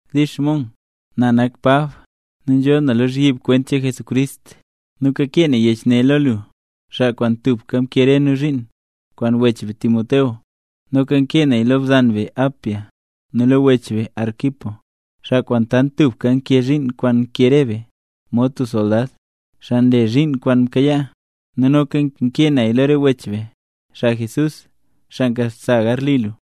Dix Mong, Na nak Pab, nu nzhoo na lozhyib kwent cheen Jesucrist, nu kakee na yech ne lo lu, xaa kwaan tubka mkee re nu zhiin, kwaan wech be Timoteo. Noka nkee naya lo bzan be Apia, nu lo wech be Arquipo, xaa kwaan tant tubka nkee zhiin kwaan nkee re be, mod tub soldad, xaa nle zhiin kwaan mkayaa. Nu noka nkee naya lo re wech be, xaa Jesús, xaa nkasa garli lu.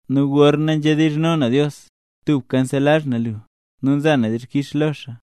Nu gorna nzhedizhno na Dios, tubka nselazh na lu, nu nza na dixkix lo Dios.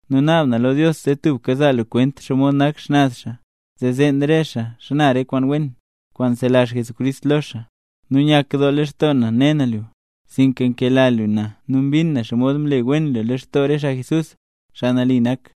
Nu naab na lo Dios zee tubka zaa lu kwent xomod nak xnaz xaa, zee zeen re xaa xana re kwaan wen, kwaan nselazh Jesucrist lo xaa. Nu nyakdoo lextoo na ne na lu, sinka nkela lu na nu mbin na xomod mle wen lu lextoo re xaa Jesús, xaa nambey nak.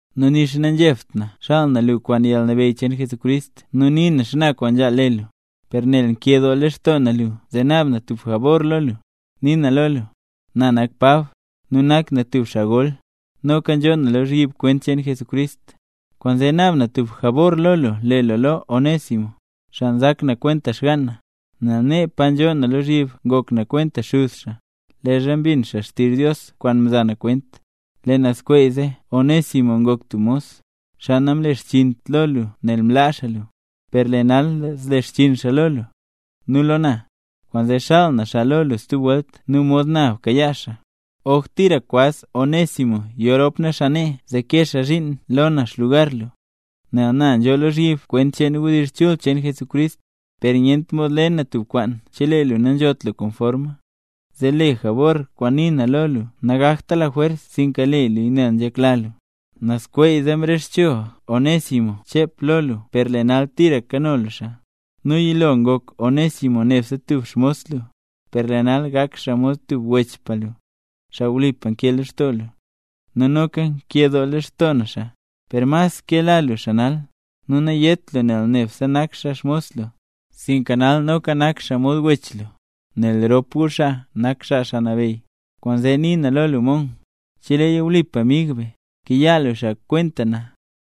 Nu nixa nanzhebt na xaal na lu kwaan yalnabeyy cheen Jesucrist nu nii na xana kwaan nzhaal le lu, per nel nkedoo lextoo na lu zee naab na tub jabor lo lu. Nii na lo lu, na nak Pab, nu nak na tub xaa gol, noka nzhoo na lozhyib kwent cheen Jesucrist, kwaanzee naab na tub jabor lo lu le lo Onésimo, xaa nzak na kwenta xgaan na. Nel nee, pa nzhoo na lozhyib ngok na kwenta xuz xaa, leezha mbin xaa xtizh Dios kwaan mza na kwent. Lee nazskweeze Onésimo ngok tub mos, xaa namlexchiint lo lu nel mlaa xaa lu. Per lee nal zlexchiin xaa lo lu, nu lo na. Kwaanzee xaal na xaa lo lu stub welt nu mod na bkayaa xaa. Oj tira kwaz Onésimo yo rop na xaa nee zee kee xaa zhiin lo na xlugar lu, nel na nzhoo lozhyib kwent cheen wdizh chul cheen Jesucrist. Per nyent mod le na tub kwaan chelee lu nanzhot lu komforma, zee lee jabor kwaan nii na lo lu nangakta lajwers, sinka le luya nel nzhekla lu. Nazskweeze mrexcho Onésimo chep lo lu per lee nal tira kano lu xaa. Nu yilo ngok Onésimo nebse tub xmos lu. Per lee nal gak xaa mod tub wechpa lu, xaa wlipa nke lextoo lu, nu noka nkedoo lextoo na xaa. Per mas kela lu xaa nal, nu nayét lu nel nebse nak xaa xmos lu, sinka nal noka nak xaa mod wech lu, nel rop gu xaa nak xaa Xaa Nabeyy. Kwaanzee nii na lo lu Mong, cheleeya wlipa mig be, kayaa lu xaa kwenta na.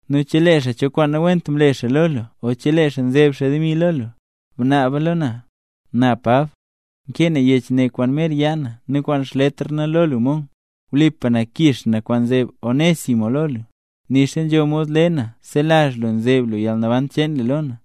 Nu chelee xaa cho kwaan nawent mle xaa lo lu o chelee xaa nzeb xaa demi lo lu, bnaaba lo na. Na Pab, nkee na yech ne kwaan mer yaa na nu kwaan xletr na lo lu Mong. Wlipa na, kix na re kwaan nzeb Onésimo lo lu. Nixa nzho mod le na selazh lu nzeb lu yalnaban cheen lu lo na.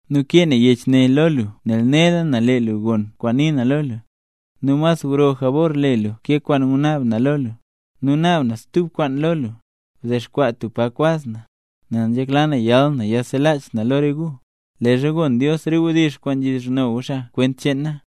Nu kakee na yech ne lo lu nel nela na lee lu gon kwaan nii na lo lu, nu mas gro jabor le lu ke kwaan ngunaab na lo lu. Nu naab na stub kwaan lo lu, bdexkwaa tub pa kwaz na, nel nzhekla na yal na yiselach na lo re gu, leezha gon Dios re wdizh kwaan nzhedizhno gu xaa kwent cheen na.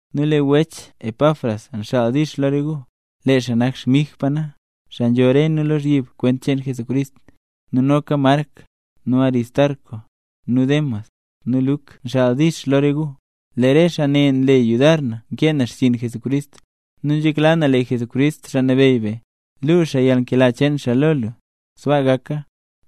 Nu lee wech Epafras nxaal “dix” lo re gu. Lee xaa nak xmigpa na, xaa nzho re nu lozhyib kwent cheen Jesucrist. Nu noka Mark, nu Aristarco, nu Demas, nu Luk nxaal “dix” lo re gu. Lee re xaa ne nle yudar na nkee na xchiin Jesucrist. Nu nzhekla na lee Jesucrist, Xaa Nabeyy be, luu xaa yalnkela cheen xaa lo gu. Sbaa gaka.